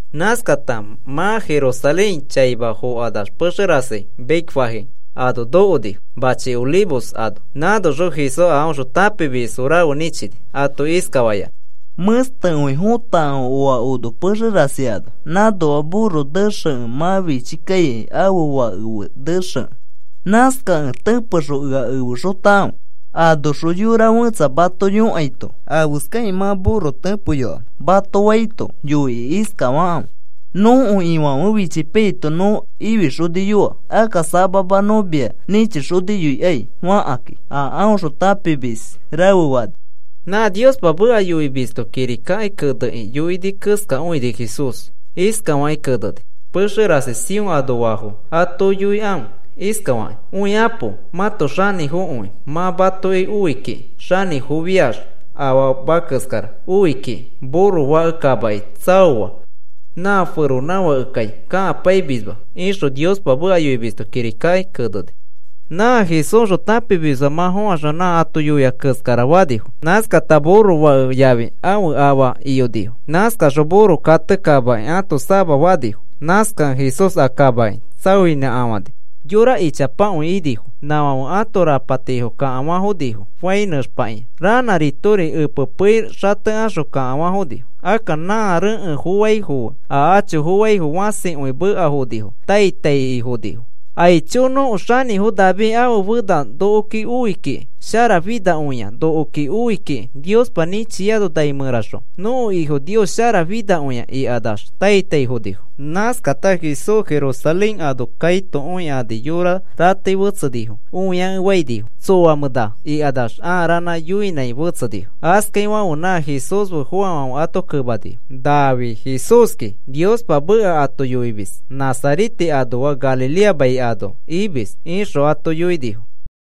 Nãskata mã Jerusalén chaima fokanax pexe rasi Betfagé ano nokonifo machi Olivos ano. Nãnoxõ Jesús a aõxõ tãpimis rafe nĩchini, ato iskafayanã: “Mẽstekõi fotakãfe oa ono pexe rasi ano. Nãnoa burro nexekẽ mã fichi kaikai ãfe fake fe nexekẽ. Nãskakẽ tẽpexõ ea efexotakãfe. Anoxõ yora fẽtsa mato yõkaito: ‘¿Afeskakĩ mã burro tẽpeyoamẽ?’ mato faito, yoikĩ iskafakãfe: ‘Nõko Ifãfe fichipaiyaito nõ ifixoniyoa. Akka samama nõ mia nĩchixoniyoikai,’ fakãki,” a aõxõ tãpimis rafe fani. Nã Niospa meka yoimisto kirikaki kenekĩ yoini keskakõini Jesús. Iskafakĩ keneni: Pexe rasi Sión anoafo ato yoikãfe iskafakĩ: “Õikapo. Mãto xanĩfokõi mã matoki oi kiki. Xanĩfofiax afama keskara oi kikĩ. Burro fake kamaki tsaoa na feronãfakekai kakapaimisma,” ixõ Niospa meka yoimisto kirika keneni. Nã Jesúsxõ tãpimisfãfe mã fõkaxõ nã ato yoia keskara fanifo. Nãskata burro fake yafi ãfe afa iyonifo. Nãskaxõ burro kate kamaki ãto sama fanifo. Nãskakẽ Jesús a kamaki tsaoinãkafãni. Yora ichapakõi inifo. Nãfãfe ãto rapatifo kakafa fonifo fai nẽxpakĩa. Ranãritori epe pei xatekaxõ kakafanifo. Akka nã rekẽ foaifo fe a acho foaifo fãsikõi mekafonifo. Tai tai fokani. “¡Aicho! ¡Nõko xanĩfo David ãfe fena nokoki oi kiki! ¡Sharafinakõia nokoki oi kiki Niospa nĩchiano nai mẽraxõ! ¡Nõko Ifo Nios sharafinakõia!” ikanax tai taifonifo. Nãskata Jesús Jerusalén ano kaito õikani yorafo ratei fetsenifo õiakefaikani. “¿Tsoamẽ na?” ikanax ãa ranã yõinãi fetsenifo. Askaifãfe nã Jesús fe foafãfe ato kemanifo: “Nafi Jesúski Niospa meka ato yoimis. Nazarete anoa Galilea mai ano imis,” ixõ ato yoinifo.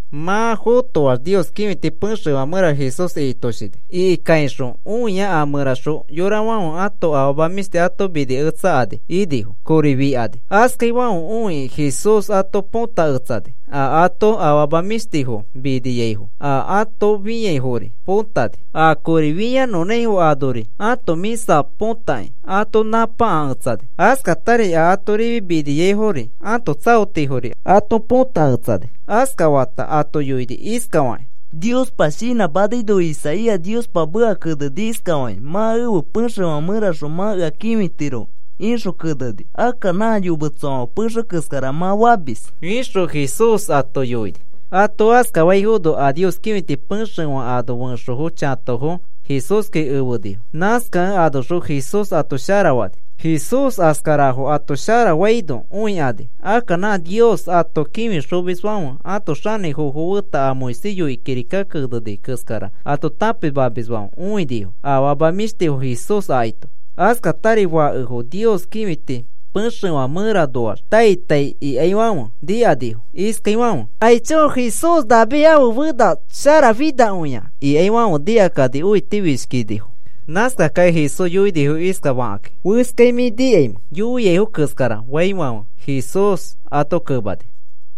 Mã fotoax Nios kĩfiti pexefã mẽra Jesús ikitoshini. Ikikaixõ õia a mẽraxõ yorafãfe ãto afama mĩshtifo ato miniketsakani inifo kori fikani. Askafaifãfe õikĩ Jesús ato põtaketsani a ato afama mĩshtifo miniaifo, a ato fĩaifori potani. A kori fĩanõnãifo anoari ãto mĩsa põtakĩ ato nãpakaketsani. Askatari a ato rifi miniaifori ãto tsaotifori ato põtaketsani. Askafata ato yoini iskafakĩ: “Niospa shinãmanaino Isaías Niospa meka keneni iskafakĩ: ‘Mã ẽfe pexefã mẽraxõ mã ea kĩfitiro,’ ixõ keneni. Akka nã yometsofãfe pexe keskara mã famis,” ixõ Jesús ato yoini. Ato askafaino a Nios kĩfiti pexefã ano fẽxofo, chatofo Jesúski fenifo. Nãskakẽ anoxõ Jesús ato sharafani. Jesús askarafo ato sharafaino õikani. Akka nã Nios ato kĩfixomisfãfe ãto xanĩfofo feta a Moisés yoikĩ kirika keneni keskara ato tãpimamisfãfe õinifo afama mĩshtifo Jesús akaito. Askatari fakefo Nios kĩfiti pexefã mẽranoaxri tai tai ikaifãfe nikanifo iskaifãfe, “¡Aicho! ¡Nã Jesús David ãfe fena sharafinakõia!” ikaifãfe nikakani õitifishkinifo. Nãskakakĩ Jesús yoinifo iskafakakĩ: “¿Oaiskai mĩ nikaimẽ yoiaifo keskara faifãfe?” Jesús ato kemani: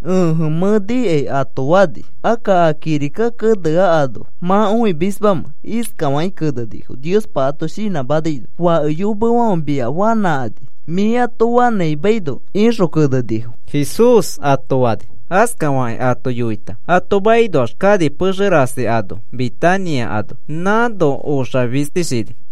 “Ẽje, mẽ nikai,” ato fani. “Akka a kirika keneano, ¿mã õimismamẽ? Iskafakĩ kenenifo, Niospa ato shinãmanaino: Fake yomefãfe mia fanãkani, mĩ ato fanãimaino, ixõ kenenifo,” Jesús ato fani. Askafakĩ ato yoita ato makinoax kani pexe rasi ano Betania ano. Nãno oxafistishini.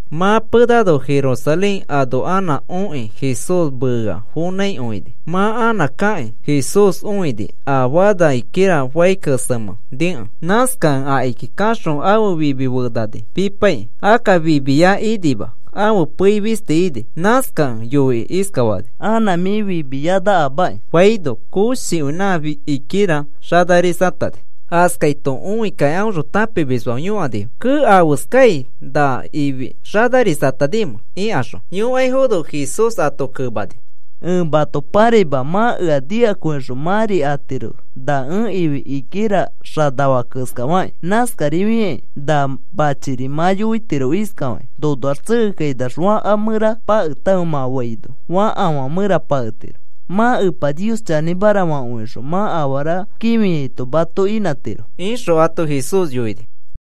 Mã penano Jerusalén ano anã okĩ Jesús meea fonãikõini. Mã anã kakĩ Jesús õini a fana higuera fai kesemẽ nikẽ. Nãskakẽ akiki kaxõ ãfe fimi fenani pipaikĩ. Akka fimiya inima, ãfe pei fisti ini. Nãskakẽ yoikĩ iskafani: “Anã mĩ fimiyanakamaki,” faino koshikõi nã higuera xanarisatani. Askaito õikakĩ aõxõ tãpimisfãfe yõkanifo: “Kee, ¿afeskai na ifi xanarisatanimẽ?” ikaxõ, yõkaifono Jesús ato kemani: “Ẽ mato pãraima mã ea nikakõixõ mãri atiro na ẽ ifi higuera xanafaa keskafakĩ. Nãskarifakĩ na machiri mã yoitiro iskafakĩ: ‘Nonoax tsekekainax fakafã mẽra paketãfe,’ mã faino fakafã mẽra paketiro. Mã Epa Nios chanĩmara fakõixõ mã afara kĩfiaito mato inãtiro,” ixõ ato Jesús yoini.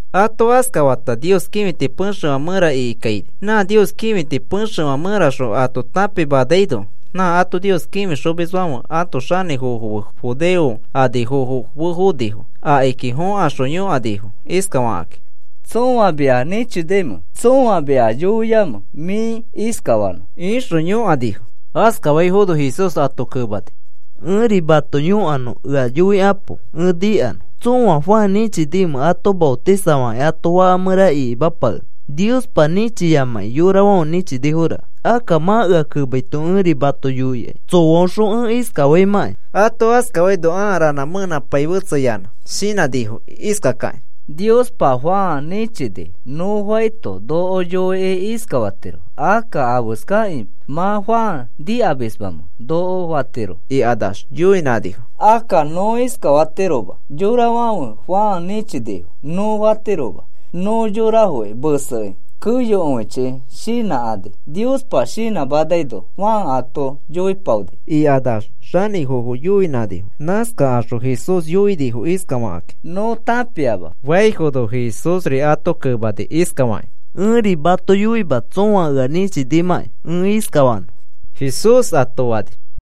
Ato askafata Nios kĩfiti pexefã mẽra ikikaini. Nã Nios kĩfiti pexefã mẽraxõ ato tãpimanaino, nã ato Nios kĩfixomisfãfe ãto xanĩfofo fe judeo anifofo fonifo. Akiki fõkaxõ yõkanifo iskafakakĩ: “¿Tsõa mia nĩchinimẽ? ¿Tsõa mia yoiamẽ mĩ iskafanõ?” ixõ yõkanifo. Askafaifono Jesús ato kemani: “Ẽri mato yõkanõ. Ea yoikapo ẽ nikanõ. ¿Tsõa Juan nĩchinimẽ ato maotisafakĩ ato faka mẽra ikimapakenõ? Niospa nĩchiyamakĩ yorafãfe nĩchiniforaka. Akka mã ea kemaito, ẽri mato yoikai tsõaõxõ ẽ iskafaimãkai.” Ato askafaino, ãa ranã mẽenãpai fetsayanã. Shinãnifo iskakakĩ: “Niospa Juan nĩchini nõ faito noko yoikĩ iskafatiro: ‘¿Akka afeskakĩ mã Juan nikamismamẽ?’ noko fatiroki,” ikanax yoinãnifo. “Akka nõ iskafatiroma: ‘Yorafãfe Juan nĩchinifo,’ nõ fatiroma. Nõ yorafoki mesei keyokõichi shinãkani Niospa shinãmanaino Juan ato yoipaoni,” ikanax xanĩfofo yoinãnifo. Nãskakaxõ Jesús yoinifo iskafakakĩ: “Nõ tãpiama,” faifono Jesúsri ato kemani iskafakĩ: “Ẽri mato yoima tsõa ea nĩchinimãkĩ ẽ iskafanõ,” Jesús ato fani.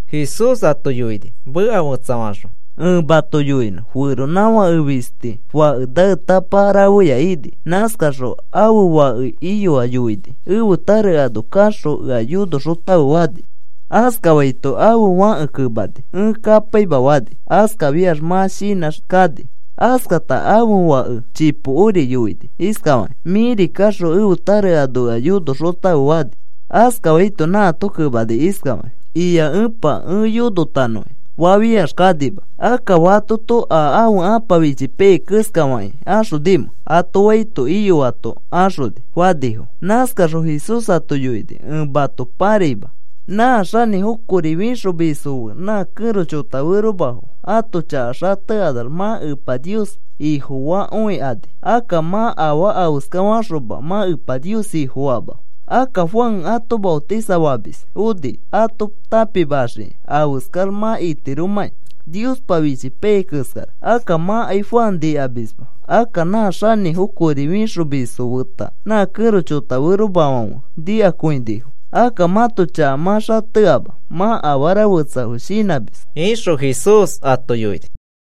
Jesús ato yoini: “Meka fetsafaxõ ẽ mato yoinõ. Feronãfake fisti fake naetapa rafeya ini. Nãskaxõ ãfe fake iyoa yoini: ‘Ẽfe tare ano kaxõ ea yonoxotãfe,’ fani. Askafaito ãfe fãke kemani: ‘Ẽ kapaima,’ fani. Askafiax mã shinãx kani. “Askata ãfe fake chipokori yoini iskafakĩ: ‘Mĩri kaxõ ẽfe tare ano ea yonoxotãfe,’ fani. Askafaito nãato kemani iskafakĩ: ‘Ia, epa. Ẽ yonotanõkĩ,’ fafiax kanima. Akka, ¿fatoto a ãfe ãpa fichipaiyai keskafakĩ axonimẽ?” ato faito, “Iyoato axoni,” fanifo. Nãskaxõ Jesús ato yoini: “Ẽ mato pãraima. Nã xanĩfo kori fĩxomisfo fe, nã kẽro chotaferomafo ãto chaka xatekanax mã Epa Nios Ifofakõikani. Akka mã afaa afeskafaxoma mã Epa Nios Ifofaama. Akka Juan ato maotisafamis oni ato tãpimaxiki afeskax mã itiromãki, Niospa fichipai keskara. Akka mãkai Juan nikamisma. Akka nã xanĩfo kori fĩxomisfo feta nã kẽro chotaferomafãfe nikakõinifo. Akka mãto chaka mã xateama mã afara fetsafo shinãmis,” ixõ Jesús ato yoini.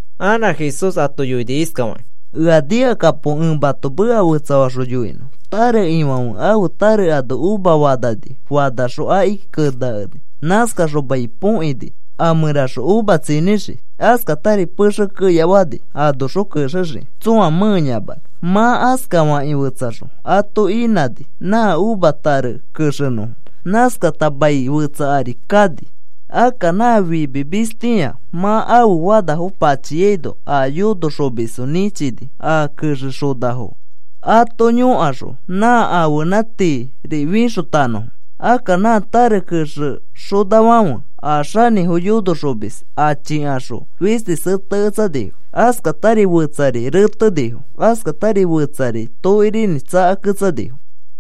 Anã Jesús ato yoini iskafakĩ: “Ea nikakapo ẽ mato meka fetsafaxõ yoinõ. Tare ifãfe ãfe tare ano uva fanani. Fanaxõ akiki keneakeni. Nãskaxõ mai põkini a mẽraxõ uva tsinĩxiki. Askatari pexe keya fani anoxõ kexexiki tsõa mẽeyamanõ. Mã askafakĩ fetsaxõ ato inãni nã uva tare kexenõfo. Nãskata mai fetsa ari kani. Akka nã fimimistĩa mã ãfe fanafo pachiaino, a yonoxomisfo nĩchini a kexexonafo ato yõkaxõ nã ãfenã tiiri fixotanõfo. Akka nã tare kexexonafãfe a xanĩfo yonoxomis achikaxõ fisti seteketsanifo. Askatari fetsari retenifo. Askatari fetsari tokirinĩ tsakaketsanifo.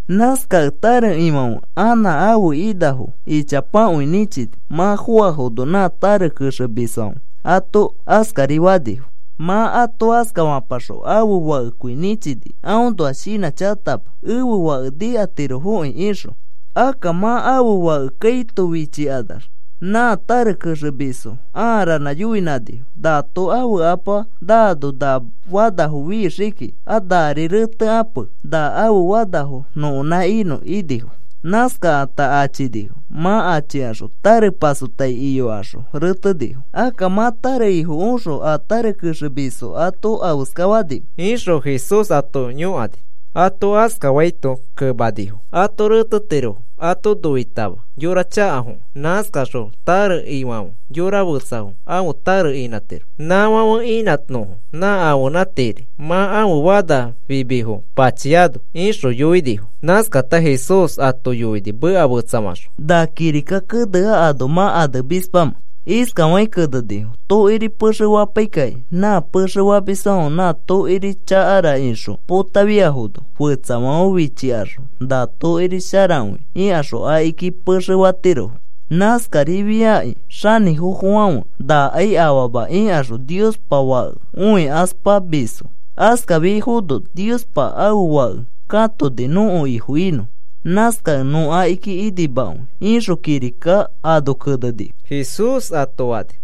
Nãskakẽ tare ifãfe anã ãfe inafo ichapakõi nĩchini. Mã foafono nã tare kexemisfãfe ato askari fanifo. “Mã ato askafapaxõ ãfe fakekõi nĩchini aõnoa shinãchakatama, ‘Ẽfe fake nikatirofokĩ,’ ixõ. Akka mã ãfe fake kaito fichikanax nã tare kexemisfo aa ranã yoinãnifo: ‘Nato ãfe apa naano na fanafo fixii kiki. A nari retekape na ãfe fanafo nõkonã inõ,’ inifo. Nãskakata achinifo. Mã achikaxõ tare pasotai iyokaxõ retenifo. Akka, ¿mã tare ifo oxõ a tare kexemisfo ato afeskafatiromẽ?” ixõ Jesús ato yõkani. Ato askafaito kemanifo: “Ato retetiro ato noitama yora chakafokẽ. Nãskaxõ tare ifãfe yora fetsafo ãfe tare inãtiro, nãfãfe inãnõfo nã ãfenã tiiri mã ãfe fana fimifo pachiano,” ixõ yoinifo. Nãskata Jesús ato yoini meka fetsafaxõ: “¿Na kirika kenea anoa mã anemismamẽ? Iskafakĩ kenenifo: Tokiri pexe fapaikakĩ nã pexe famisfãfe na tokiri chakara ixõ potafiafono, fetsafãfe fichikaxõ na tokiri sharakõi ikaxõ akiki pexe fatirofo. Nãskarifiakĩ xanĩfofofãfe, ‘Nakai afama,’ ikaxõ Niospa Fake õikaspamisfo. Askafafiaifono Niospa ãfe Fake katoni nõko Ifo inõ. Nãskakẽ nõ akiki inimakõi, ixõ kirika ano kenenifo,” Jesús ato fani.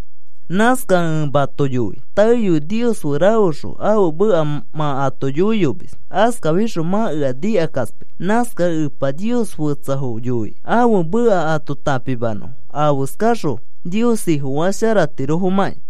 “Nãskakẽ ẽ mato yoi, taeyoi Nios fe rafexõ ãfe meka mã ato yoiyomis. Askafixõ mã ea nikakaspai. Nãskakẽ Epa Niospa fetsafo yoi ãfe meka ato tãpimanõfo afeska faxõ Nios Ifo sharakõifatiromakĩ.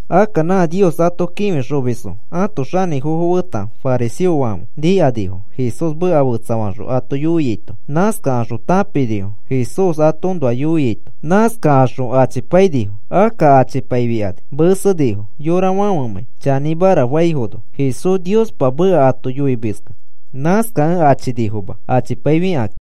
Akka nã Nios ato kĩfixomisfo ãto xanĩfofo feta fariseofãfe nikanifo Jesús meka fetsafaxõ ato yoiaito. Nãskakaxõ tãpinifo Jesús atoõnoa yoiaito. Nãskakaxõ achipainifo. Akka achipaifikani mesenifo yorafãfemãi chanĩmara faifono Jesús Niospa meka ato yoimiskẽ. Nãskakẽ achinifoma achipaifikakĩ.